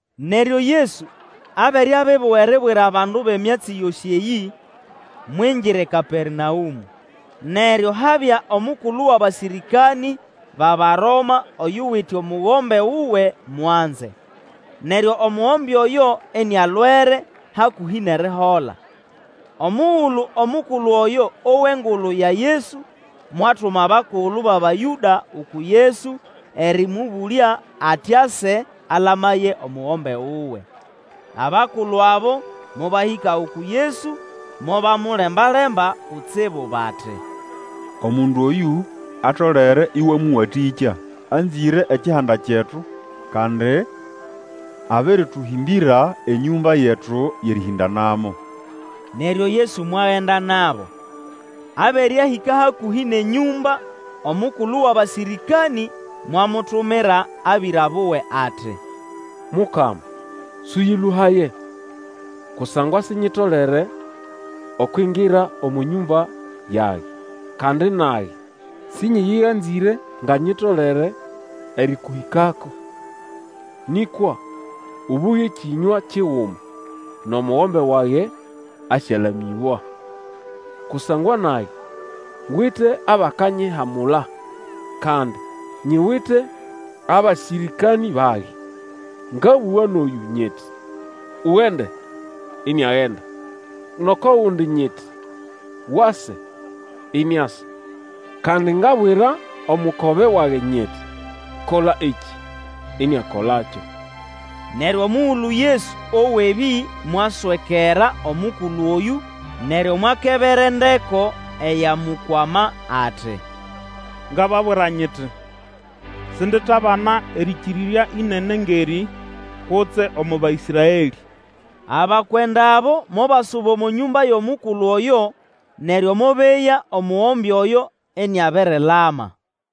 Neryo Yesu abere abibuga eribwira abandu emyatsi yosĩ eyĩ, mwingira eKapernaũmũ. Neryo habya omukulu wʼabasĩrĩkanĩ bʼAbaroma oyuwite omugombe wuwe mwanze. Neryo omugombe oyo inialwere hakũhĩ nʼerihola. Omugulu omukulu oyo owa engulu ya Yesu, mwatuma abakulu bʼAbayũda uku Yesu erĩmũbũlya ati ase alamaye omugombe wuwe. Abakulu abo mobahĩka uku Yesu, mobamulemba-lemba kutsibu bati, Omundu oyũ atolere ĩwamũwatĩkya. Anzĩre ekihanda kyetu, kandi abĩrĩtũhĩmbĩra enyũmba yetu yʼerĩhĩndanamo. Neryo Yesu mwagenda nabo. Abere ahĩka hakũhĩ nʼenyũmba, omukulu wʼabasĩrĩkanĩ mwamutumira abĩra buwe ati. Mukama, Sũyĩlũhaye, kusangwa sinyitolere ukingira omo nyũmba yage; kandi nage sĩnyĩyĩganzĩre nga nyitolere erĩkũhĩkako. Nĩkwa ũbũge kĩnywa kiguma, nʼomugombe wage asyalamĩbwa. Kusangwa nage ngwite abakanyihamula, kandi nyiwite abasĩrĩkanĩ bage, ngabũga nʼoyũ nyiti, Ugende, iniagenda; nʼoko gundi nyiti, Wase, iniasa; kandi ngabwira omukobe wage nyiti, Kola ekĩ, iniakoiakyo. Neryo omugulu Yesu owa ebĩ mwaswekera omukulu oyũ, neryo mwakebera endeko eyamukwama ati, Ngababwira nyiti, Sinditabana erĩkĩrya ĩnene ngʼerĩ, kutse omo Baĩsraelĩ. Abakwenda abo mobasuba omo nyũmba yʼomukulu oyo, neryo mobeya omugombe oyo iniabirilama.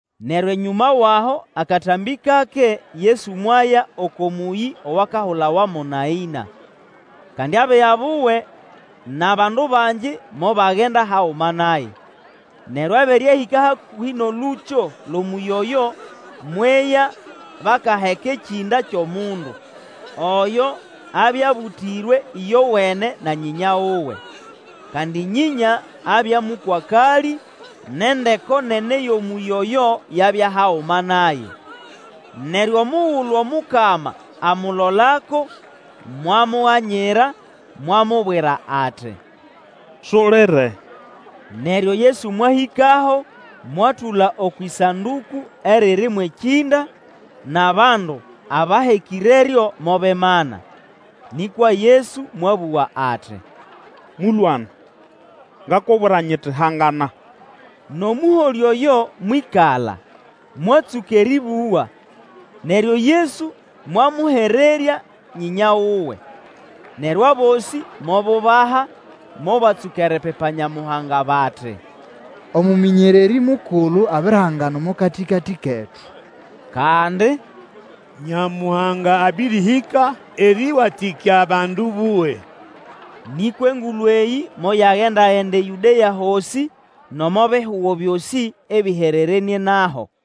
Neryo enyũma wʼaho akatambĩ kake Yesu mwaya oko mũyĩ owakahulawa mo Naĩna. Kandi abiga buwe nʼabandu bangi mobagenda haguma naye. Neryo abere ahĩka hakũhĩ nʼolũkyo lwʼomũyĩ oyo, mweya bakaheka ekĩnda kyʼomundu. Oyo abya abũtĩrwe ĩyowene na nyĩnya wuwe. Kandi nyĩnya abya mũkwakalĩ, nʼendeko nene yʼomũyĩ oyo yabya haguma naye. Neryo mugulu Omukama amulolako, mwamuganyira, mwamubwira ati, Sulire. Neryo Yesu mwahĩkaho mwatũla okwʼĩsandũkũ eriri mwʼekĩnda, nʼabandu abahekĩreryo mobimana. Nĩkwa Yesu mwabũga ati, Mũlwana, ngakubwira nyiti, Hangana! Nʼomũholĩ oyo mwĩkala, mwatsũka erĩbũga, neryo Yesu mwamũhererya nyĩnya wuwe. Neryo abosĩ mobubaha, mobatsũka eripipa Nyamuhanga, bati, Omũmĩnyererĩ mukulu abirihangana omo katĩkatĩ ketu! Kandi, Nyamuhanga abĩrĩhĩka erĩwatĩkya abandu buwe. Nĩkwa engulu eyĩ moyagenda-genda eYũdea hosĩ, nʼomo bihugo byosĩ ebĩhererenĩe naho.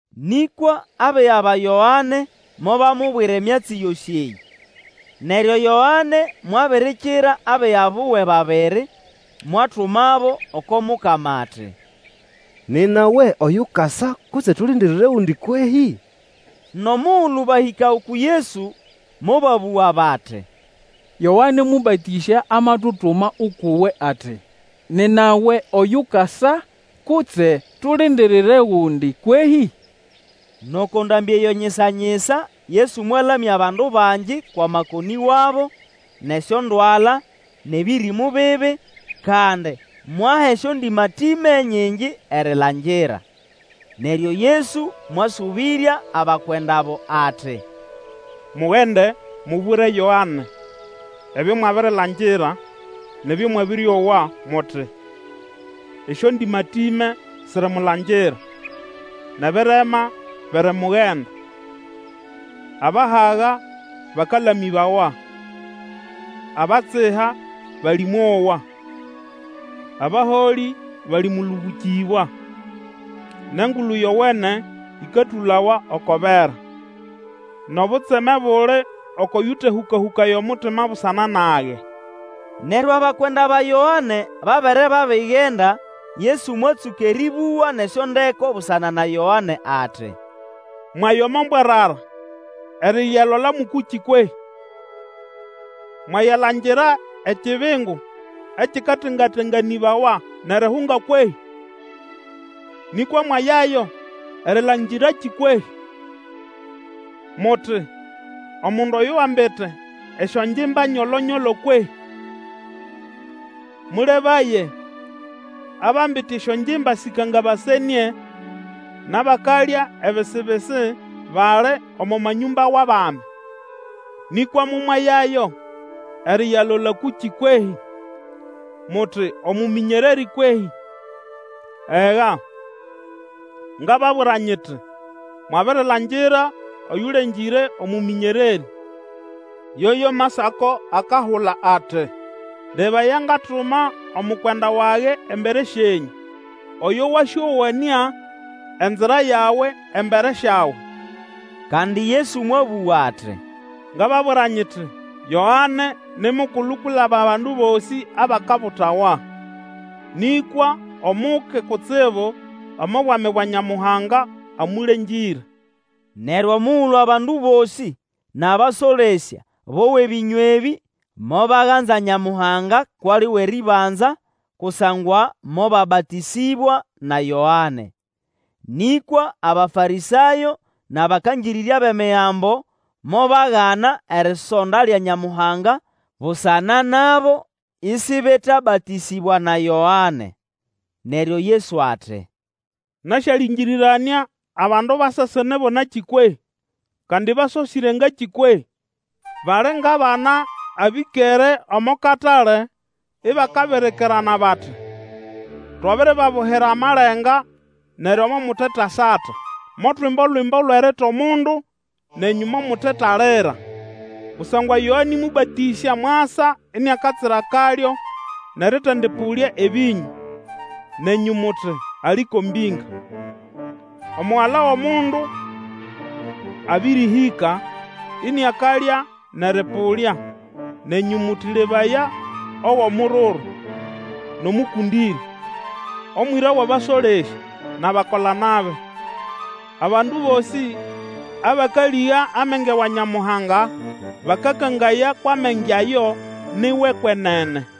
Nĩkwa abiga ba Yoane mobamubwira emyatsi yosĩ eyĩ. Neryo Yoane mwabirikira abiga buwe babiri, mwatumabo oko Mukama ati, Nina we oyukasa, kutse tulindirire gundi kwehĩ? Nʼomugulu bahĩka uku Yesu, mobabũga bati, Yoane Mũbatĩsya amatutuma ukʼuwe ati, Nina we oyukasa, kutse tulindirire gundi kwehĩ? Nʼoko ndambĩ eyo nyisa-nyisa Yesu mwalamya bandu bangi kwʼamakonĩ wabo, nʼesyondwala, nʼebĩrĩmũ bibi; kandi mwaha esyondĩmatĩme nyingi erilangira. Neryo Yesu mwasũbĩrya abakwenda abo ati, Mugende, mubwire Yoane, ebyo mwabirilangira nʼebyo mwabĩrĩowa, muti, esyondĩmatĩme sirimulangira, nʼebirema birimugenda, abahaga bakalamĩbawa, abatsiha balĩmowa, abaholĩ balĩmũlũbũkĩbwa, nʼEngulu Yowene ĩkatũlawa oko bera. Nʼobutseme buli oko yutehũkahũkaya omutima busana nage. Neryo abakwenda ba Yoane babere babigenda, Yesu mwatsũka erĩbũga nʼesyondeko busana na Yoane ati, Mwaya omo mbwarara eriyalola mʼũkũkĩ kwehĩ? Mwayalangira ekibingu ekikatengatenganĩbawa nʼerihunga kwehĩ? Nĩkwa mwayayo erilangirakĩ kwehĩ? Muti, Omundu oyo wambite esyongimba nyolo-nyolo kwehĩ? Mũlebaye, abambite esyongimba sĩkangabasenĩe nʼabakalya ebisi-bisi bali omo manyũmba wʼabami. Nĩkwa momwayayo eriyalola kũkĩ kwehĩ? Muti, Omũmĩnyererĩ kwehĩ? Ega, ngababwira nyiti, Mwabirilangira oyũlengĩre omũmĩnyererĩ. Yoyo Masako akahula ati, Lebaya, ngatuma omukwenda wage embere syenyũ, Oyo wasyowanĩa enzira yawe embere syawe. Kandi Yesu mwabũga ati, Ngababwira nyiti, Yoane ni mukulu kwilaba abandu bosĩ abakabutawa; nĩkwa Omuke kutsibu omo bwami bwa Nyamuhanga amũlengĩre. Neryo omugulu abandu bosĩ nʼabasolesya bowa ebĩnywa ebĩ, mobaganza Nyamuhanga kwʼali wʼerĩbanza, kusangwa mobabatĩsĩbwa na Yoane. Nĩkwa Abafarĩsayo nʼabakangĩrĩrya bʼEmigambo mobagana erisonda lya Nyamuhanga busana nabo, isibetabatĩsĩbwa na Yoane. Neryo Yesu ati, Nasyalĩngĩrĩranĩa abandu ba sesene bo nakĩ kwehĩ? Kandi basosĩre ngakĩ kwehĩ? Bali ngʼabana abĩkere omo katale ibakabirikirana bati, Twabiribabuhira amalenga, neryo momutetasata; motwimba Olwimbo lwʼerita omundu, nenyũ momutetalira. Kusangwa Yoane Mũbatĩsya mwasa iniakatsira akalyo, nʼerĩtendĩpũlya ebĩnyũ; nenyũ muti, Ali ko mbĩnga. Omugala wʼOmundu abĩrĩhĩka, iniakalya nʼerĩpũlya; nenyũ muti, Lebaya, owʼomururu, nʼomũkũndĩrya, omwĩra wʼabasolesya nʼabakola-nabi. Abandu bosĩ abakalĩga amenge wa Nyamuhanga bakakangaya kwʼamenge ayo ni wʼekwenene.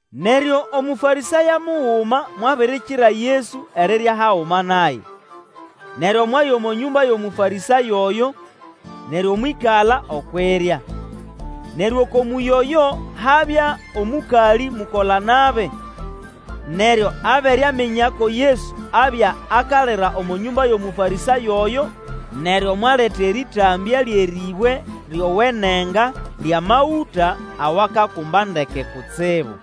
Neryo Omũfarĩsayo muguma mwabirikira Yesu erirya haguma naye. Neryo mwaya omo nyũmba yʼOmũfarĩsayo oyo, neryo mwĩkala okwʼirya. Neryo oko mũyĩ oyo habya omũkalĩ mukola-nabi. Neryo abere aminya ko Yesu abya akalira omo nyũmba yʼOmũfarĩsayo oyo, neryo mwaleta erĩtambya lyʼerĩbwe lyowenenga lyʼamagũta awakakumba ndeke kutsibu.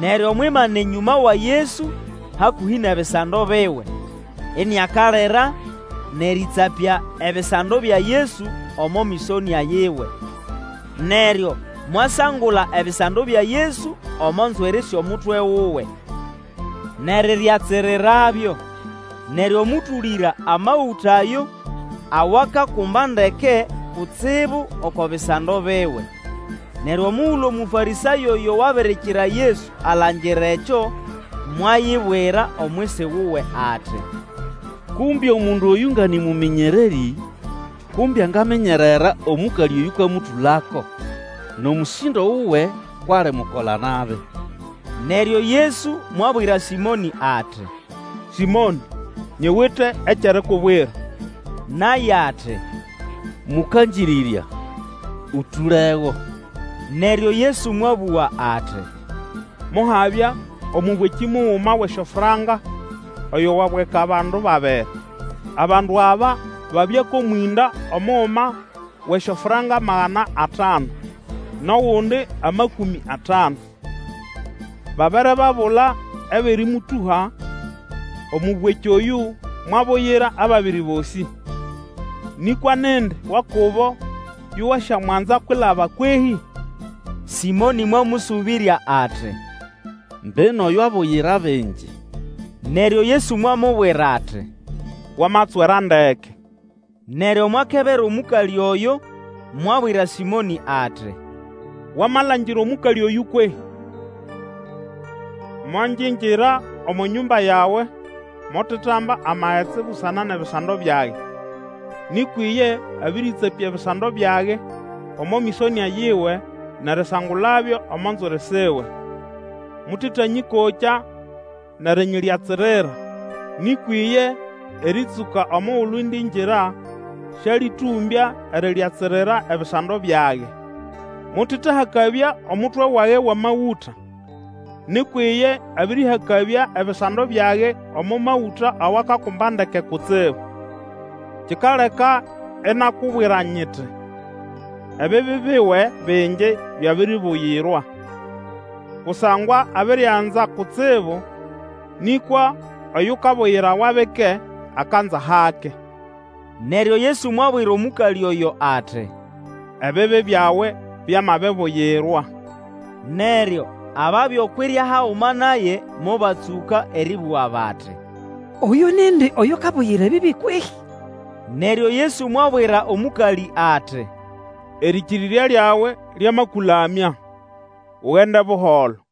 Neryo mwimana enyũma wa Yesu hakũhĩ nʼebisando biwe, iniakalira nʼerĩtsapya ebisando bya Yesu omo mĩsonĩa yiwe. Neryo mwasangula ebisando bya Yesu omo nzwiri syʼomutwe wuwe, nʼeriryatsirirabyo, neryo mũtũlĩra amagũta ayo awakakumba ndeke kutsibu oko bisando biwe. Neryo omugulu Omũfarĩsayo oyo wabirikira Yesu alangira ekyo, mwayibwira omwisi wuwe ati, Kumbe omundu oyũ nga nĩ mũmĩnyererĩ, kumbe angaminyerera omũkalĩ oyũkamũtũlako, nʼomũsĩndo wuwe kwʼali mukola-nabi. Neryo Yesu mwabwira Sĩmonĩ ati, Sĩmonĩ nyiwite ekyʼerikubwira. Naye ati, Mũkangĩrĩrya, ũtũlego. Neryo Yesu mwabũga ati, Mohabya omũbwekĩ muguma wʼesyofranka oyo wabweka abandu babiri. Abandu aba babya kʼomwĩnda, omuguma wʼesyofranka magana atanu, nʼogundi amakũmĩ atanu. Babere babula ebyʼerĩmũtũha, omũbwekĩ oyũ mwabuyira ababiri bosĩ. Nĩkwa nindi wa kubo yo wasyamwanza kwilaba kwehĩ? Sĩmonĩ mwamũsũbĩrya ati, Mbino oyo abuyira bingi. Neryo Yesu mwamubwira ati, Wamatswera ndeke. Neryo mwakebera omũkalĩ oyo, mwabwira Sĩmonĩ ati, Wamalangira omũkalĩ oyũ kwehĩ? Mongingira omo nyũmba yawe; mutetamba amagetsi busana nʼebisando byage, nĩkwa iye abĩrĩtsapya ebisando byage omo mĩsonĩa yiwe nʼerisangulabyo omo nzwiri siwe. Mũtetariyĩkokya nʼerinyiryatsirira; nĩkwa iye erĩtsũka omugulu indingira sĩalĩtũmbya eriryatsirira ebisando byage. Mutetahakabya omutwe wage wʼamagũta, nĩkwa iye abĩrĩhakabya ebisando byage omo magũta awakakumba ndeke kutsibu. Kikaleka inakubwira nyiti, Ebibi biwe bingi byabiribuyirwa, kusangwa abirianza kutsibu; nĩkwa oyukabuyirawa bike, akanza hake. Neryo Yesu mwabwira omũkalĩ oyo ati, Ebibi byawe byamabibuyirwa. Neryo ababya okwʼirya haguma naye, mobatsũka erĩbũga bati, Oyũ nindi oyukabuyira ebibi kwehĩ? Neryo Yesu mwabwira omũkalĩ ati, Erĩkĩrĩrya lyawe lyamakũlamya; ugende buholo.